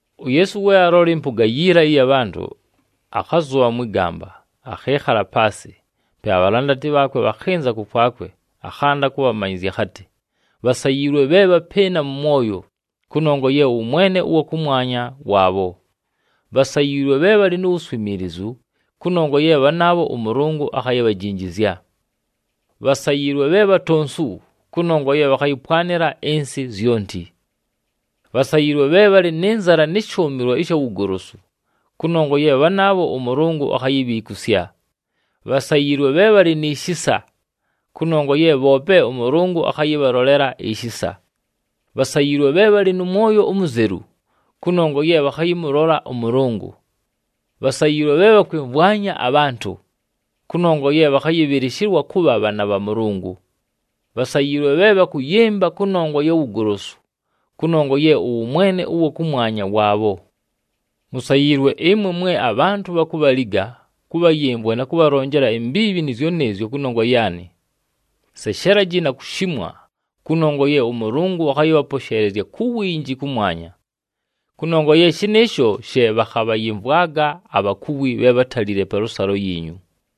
UYeesu we aalola ɨmpʉga yiila ɨya bhantʉ, akhazʉbha mwɨ gamba, akhɨɨkhala paasɨ. Pe abhalandati bhaakwe bhakhɨnza kʉkwakwe, akhanda kʉbhamanyɨzya akhatɨ, “Bhasayiilwe bhe bhapɨɨna mʉ mwoyo, kʉnongwa ye ʉwʉmwene ʉwa kʉmwanya waabho. Bhasayiilwe bhe bhalɨ nu wuswimiilizu, kʉnongwa ye bhanaabho ʉMʉlʉngʉ akhayibhajinjizya. Bhasayiilwe bhe bhatonsu, kʉnongwa ye bhakhayɨpwanɨla ɨnsɨ zyonti. Bhasayiilwe bhe bhalɨ nɨ nzala nɨ shʉʉmɨlwa ɨsha wugolosu, kʉnongwa ye bhanaabho ʉMʉlʉngʉ akhayibhiikusya. Bhasayiilwe bhe bhalɨ ni shisa, kʉnongwa ye bhoope ʉMʉlʉngʉ akhayɨbhalolela ishisa. Bhasayiilwe bhe bhalɨ nʉ mwoyo umuzelu, kʉnongwa ye bhakhayɨmʉlola ʉMʉlʉngʉ. Bhasayiilwe bhe bhakwɨmvwanya abhantʉ, kʉnongwa ye bhakhayɨbhɨlɨshɨlwa kʉbha bhaana bha Mʉlʉngʉ. Bhasayiilwe bhe bhakʉyɨmba kʉnongwa ya wugolosu, kʉnongwa ye ʉwʉmwene ʉwa kʉmwanya waabho. “Musayiilwe ɨmwe mwe abhantʉ bhakubhaliga, kʉbhayɨmvwa na kʉbhalonjela imbiibhi nɨɨzyo nɨɨzyo kʉnongwa yaanɨ. Seshelaji na kushimwa, kʉnongwa ye ʉMʉlʉngʉ akhayɨbhaposheelezya ku winji kʉmwanya, kʉnongwa ye shɨnɨɨsho she bhakhabhayɨmvwaga abhakuwi bhe bhátalile palʉsalo yiinyu.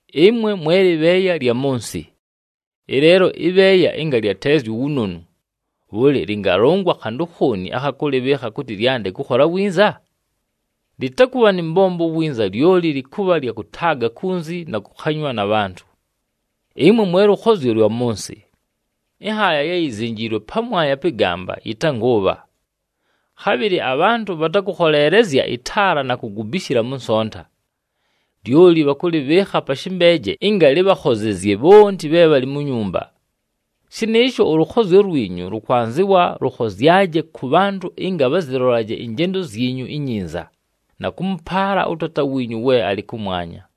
“Ɨmwe mwe lɨbheeya lya mʉ nsɨ! Ɨleelo ɨbheeya ɨnga lyateezya uwunonu, bhʉlɨ lɨngalʉngwa khantʉ khooni akha kʉlɨbhɨɨkha kʉtɨ lyande kʉkhola winza? Lɨtakʉbha nɨ mbombo winza, lyoli lɨkʉbha lya kʉtaaga kunzi, na kʉkhanywa na bhantʉ. “Ɨmwe mwe lʉkhozyo lwa mʉ nsɨ! Ɨnhaaya ye yizenjiilwe pamwanya pɨ gamba, yɨtangʉʉbha. Khabhɨlɨ abhantʉ bhatakʉkholeelezya ɨtaala na kugubishila mʉ nsonta, lyoli bhakʉlɨbhɨɨkha pa shɨmbeeje ɨnga lɨbhakhozezye bhonti bhe bhalɨ mu nyumba. Shɨnɨɨsho ʉlʉkhozyo lwinyu, lʉkwanzɨwa lʉkhozyaje kʉ bhantʉ ɨnga bhazɨlolaje ɨnjendo zyinyu inyinza, na kʉmʉpaala ʉTaata wiinyu we alɨ kʉmwanya.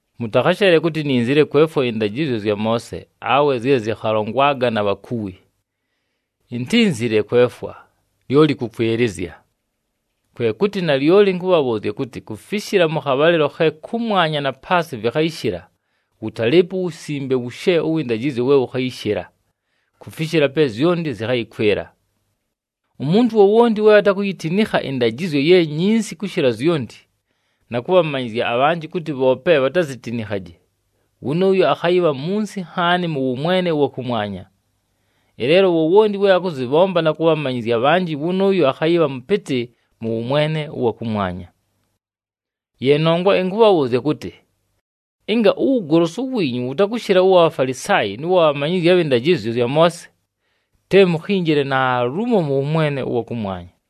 “Mʉtakhasheele kʉtɨ ininzile kwefwa ɨndajɨzyo zya Moose, awe zye zɨkhalongwaga na bhakuwi. Intínzile kwefwa, lyoli kʉkwɨlɨzya. Kwe kʉtɨ, nalyoli ɨnkʉbhabhʉʉzya kʉtɨ, kufishila mʉ khabhalɨlo khe kʉmwanya na paasɨ vɨkhayɨshɨla, wʉtalɨɨpo uwusimbe wushe ʉwɨ ndajɨzyo we wʉkhayɨshɨla kufishila pe zyonti zɨkhayɨkwɨla. Umuntu wowonti we atakuyitinikha ɨndajɨzyo ye nyinsi kʉshɨla zyonti, na kʉbhamanyɨzya abhanjɨ kʉtɨ bhoope bhatazitinikhaje, wʉnʉʉyo, akhayɨbha munsi nhaani mʉ wʉmwene ʉwa kʉmwanya. Ɨleelo wowonti we akʉzɨbhomba na kʉbhamanyɨzya abhanjɨ, wʉnʉʉyo akhayɨbha mʉpɨtɨ mʉ wʉmwene ʉwa kʉmwanya. Ye nongwa ɨnkʉbhabhʉʉzya kʉtɨ, ɨnga uwugolosu wiinyu wʉtakʉshɨla ʉwa Bhafalisaayi nʉ wa bhamanyizyi abhɨ ndajɨzyo zya Moose, te mukhinjile naalumo mʉ wʉmwene ʉwa kʉmwanya.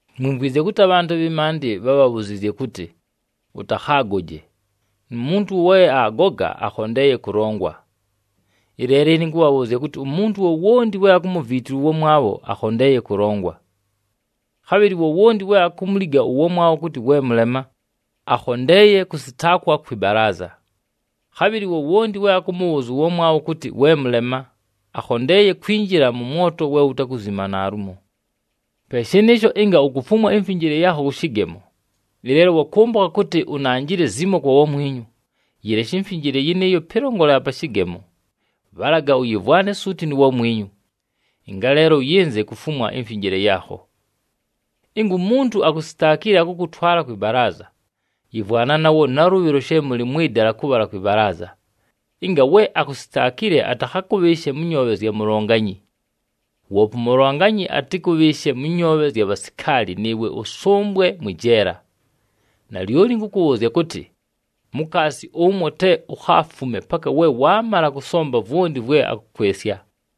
“Mwimvwizye kʉtɨ abhantʉ abhɨ maandɨ bhábhabhuziizye kʉtɨ, ‘Ʉtakhaagoje, nu muntu we aagoga akhondeeye kʉlongwa.’ Ɨleelo ɨne ɨnkʉbhabhʉʉzya kʉtɨ, umuntu wowonti we akumuviitilwa ʉwamwabho, akhondeeye kʉlongwa. Khabhɨlɨ wowonti we akumuliga ʉwamwabho kʉtɨ, ‘We mʉlema,’ akhondeeye kʉsɨtaakwa kwɨ balaaza. Khabhɨlɨ wowonti we akʉmʉbhʉʉzya ʉwamwabho kʉtɨ, ‘We mʉlema,’ akhondeeye kwinjila mʉ mwoto we wutakuzima naalumo! “Pe shɨnɨɨsho, ɨnga ukufumwa imfinjile yaakho kʉ shɨgemo, ɨleelo wakʉmbʉkha kʉtɨ unanjile zimo kwa wamwinyu, yɨleshe imfinjile yɨnɨɨyo pɨlongolela pa shɨgemo, bhalaga ʉyɨmvwane suuti nu wamwinyu. Ɨngaleelo ʉyɨnze kufumwa imfinjile yaakho. “Ɨnga umuntu akusitaakile, akʉkʉtwala kwɨ balaaza, yɨmvwana nawo nalʉbhɨlo she mʉlɨ mwɨ dala kʉbhala kwɨ balaaza, ɨnga we akusitaakile atakhakʉbhɨɨshe mʉ nyoobhe zya mulonganyi. Woope umulonganyi, atɨkʉbhɨɨshe mʉ nyoobhe zya bhasikaali nɨɨwe ʉsʉmbwe mwɨ jeela. Nalyoli ɨnkʉkʉbhʉʉzya kʉtɨ, mukaasi ʉmwo te ukhaafume paka we waamala kʉsomba vwonti vwe akʉkwɨsya!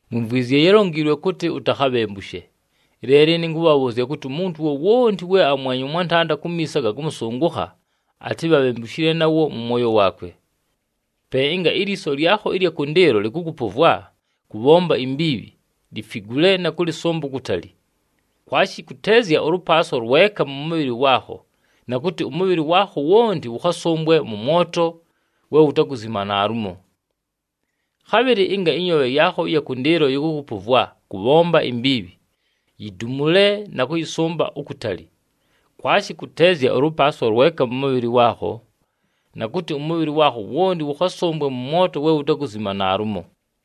“Mwimvwizye yálonjiilwe kʉtɨ, ‘Utakhabhembushe.’ Ɨleelo ɨne ɨnkʉbhabhʉʉzya kʉtɨ, umuntu wowonti we amwenya ʉmwantanda kumiiso aga kʉmʉsʉngʉkha, atɨbhe abhembushile nawo mʉ mwoyo waakwe. Pe ɨnga ilyiso lyakho ɨlya kʉndɨɨlo lɨkʉkʉpʉvwa kʉbhomba imbiibhi, lifigule na kʉlɨsʉmba ukutali. Kwashi kʉteezya ʉlʉpaaswa lweka mʉ mʉbhɨlɨ waakho, na kʉtɨ ʉmʉbhɨlɨ waakho wonti wʉkhasʉmbwe mʉ mwoto we wutakuzima naalumo. Khabhɨlɨ ɨnga ɨnyoobhe yaakho ɨya kʉndɨɨlo yɨkʉkʉpʉvwa kʉbhomba imbiibhi, yidumule na kʉyɨsʉmba ukutali. Kwashi kʉteezya ʉlʉpaaswa lweka mʉ mʉbhɨlɨ waakho, na kʉtɨ ʉmʉbhɨlɨ waakho wonti wʉkhasʉmbwe mʉ mwoto we wutakuzima naalumo.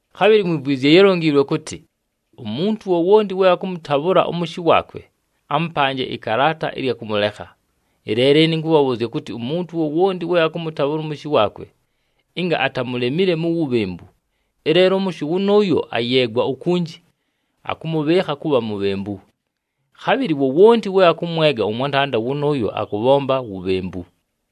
“Khabhɨlɨ mwimvwizye yálonjiilwe kʉtɨ, ‘Umuntu wowonti we akʉmʉtabhʉla ʉmʉshɨ waakwe, amʉpanje ɨkalaata ɨlya kʉmʉlekha.’ Ɨleelo ɨne ɨnkʉbhabhʉʉzya kʉtɨ, umuntu wowonti we akʉmʉtabhʉla ʉmʉshɨ waakwe, ɨnga atamulemile mu wubhembu, ɨleelo ʉmʉshɨ wʉnʉʉyo ayeegwa ukunji, akʉmʉbhɨɨkha kʉbha mubhembu. Khabhɨlɨ wowonti we akʉmwega ʉmwantanda wʉnʉʉyo akʉbhomba wubhembu.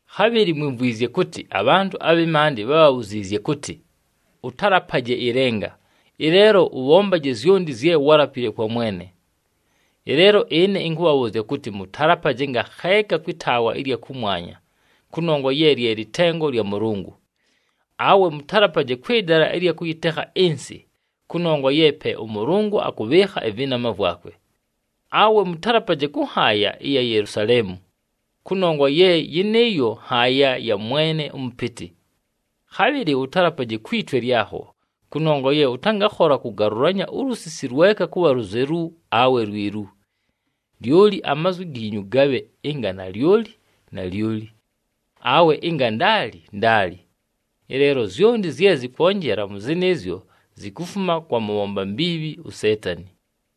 “Khabhɨlɨ mwimvwizye kʉtɨ abhantʉ abhɨ maandɨ bhábhabhuziizye kʉtɨ, ‘Ʉtalapaje ɨlenga. Ɨleelo ʉbhombaje zyonti zye wálapile kwa Mwene.’ Ɨleelo ɨne ɨnkʉbhabhʉʉzya kʉtɨ, mʉtalapaje ngakheeka kwɨ taawa ɨlya kʉmwanya kʉnongwa ye lye lɨtengo lya Mʉlʉngʉ, awe mʉtalapaje kwɨ dala ɨlya kʉyɨtekha ɨnsɨ kʉnongwa ye pe ʉMʉlʉngʉ akʉbhɨɨkha ɨvɨnama vwakwe. Awe mʉtalapaje kʉ nhaaya ɨya Yelusaleemu kʉnongwa ye yɨnɨɨyo nhaaya ya Mwene ʉMʉpɨtɨ. Khabhɨlɨ ʉtalapaje kwi twe lyakho, kʉnongwa ye ʉtangakhola kʉgalʉlanya ulusisi lweka kʉbha luzelu awe lwilu. Lyoli amazwi giinyu gabhe ɨnga ‘Nalyoli,’ ‘Nalyoli.’ Awe ɨnga ‘Ndaali,’ ‘Ndaali.’ Ɨleelo zyonti zye zɨkwonjela mʉ zɨnɨɨzyo, zikufuma kwa mʉbhomba mbiibhi uSeetani.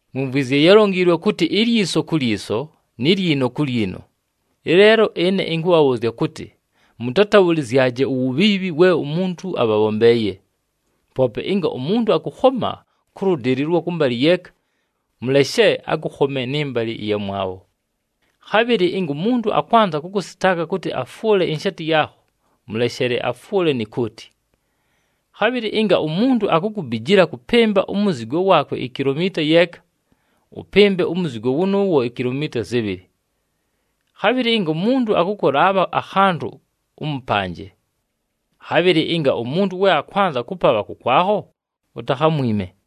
“Mwimvwizye yálonjiilwe kʉtɨ, ‘Ilyiso ku lyiso ni lyino ku lyino.’ Ɨleelo ɨne ɨnkʉbhabhʉʉzya kʉtɨ, mʉtatabhʉlɨzyaje uwubhiibhi we umuntu abhabhombeeye. Poope ɨnga umuntu akʉkhoma kʉ lʉdɨlɨ ʉlwɨ mbalɨ yeeka, mʉleshe akʉkhome nɨ mbalɨ ɨyamwabho. Khabhɨlɨ ɨnga umuntu akwanza kʉkʉsɨtaaka kʉtɨ afwʉle inshaati yaakho, mʉleshele afwʉle ni kooti. Khabhɨlɨ ɨnga umuntu akukubijila kʉpɨmba umuzigo waakwe ikilomiita yeeka, ʉpɨmbe umuzigo wʉnʉʉwo ikilomiita zɨbhɨlɨ. Khabhɨlɨ ɨnga umuntu akʉkʉlaabha akhantʉ, ʉmʉpanje. Khabhɨlɨ ɨnga umuntu we akwanza kʉpabha kʉkwakho, utakhamwime.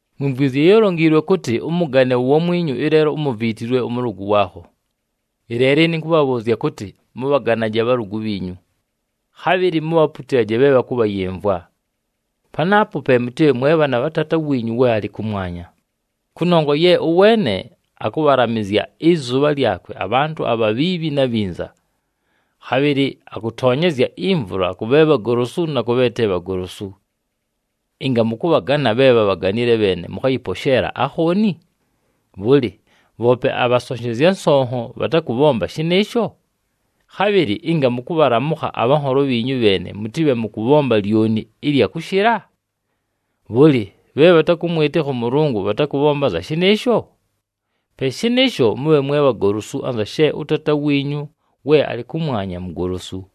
“Mwimvwizye yálonjiilwe kʉtɨ, ‘Ʉmʉgane uwamwinyu, ɨleelo umuviitilwe ʉmʉlʉgʉ waakho.’ Ɨleelo ɨne ɨnkʉbhabhʉʉzya kʉtɨ, mʉbhaganaje abhalʉgʉ bhiinyu. Khabhɨlɨ mubhaputilaje bhe bhakʉbhayɨmvwa. Panaapo pe mʉtɨbhe mwe bhaana bha Taata wiinyu we alɨ kʉmwanya. Kʉnongwa ye ʉweene akʉbhalamɨzya ɨzʉbha lyakwe abhantʉ abhabhiibhi na bhinza. Khabhɨlɨ akʉtonyezya imvula kʉ bhe bhagolosu na kʉ bhe te bhagolosu. Ɨnga mʉkʉbhagana bhe bhabhaganile bheene, mʉkhayɨposheela akhooni? Bhʉlɨ, bhoope abhasonshezya nsonho bhatakʉbhomba shɨnɨɨsho? Khabhɨlɨ ɨnga mʉkʉbhalamʉkha abhanholo bhiinyu bheene, mʉtɨbhe mʉkʉbhomba lyoni ɨlya kʉshɨla? Bhʉlɨ, bhe bhatakʉmwɨtɨkha ʉMʉlʉngʉ bhatakʉbhomba anza shɨnɨɨsho? Pe shɨnɨɨsho mʉbhe mwe bhagolosu anza she ʉTaata wiinyu we alɨ kʉmwanya mugolosu.”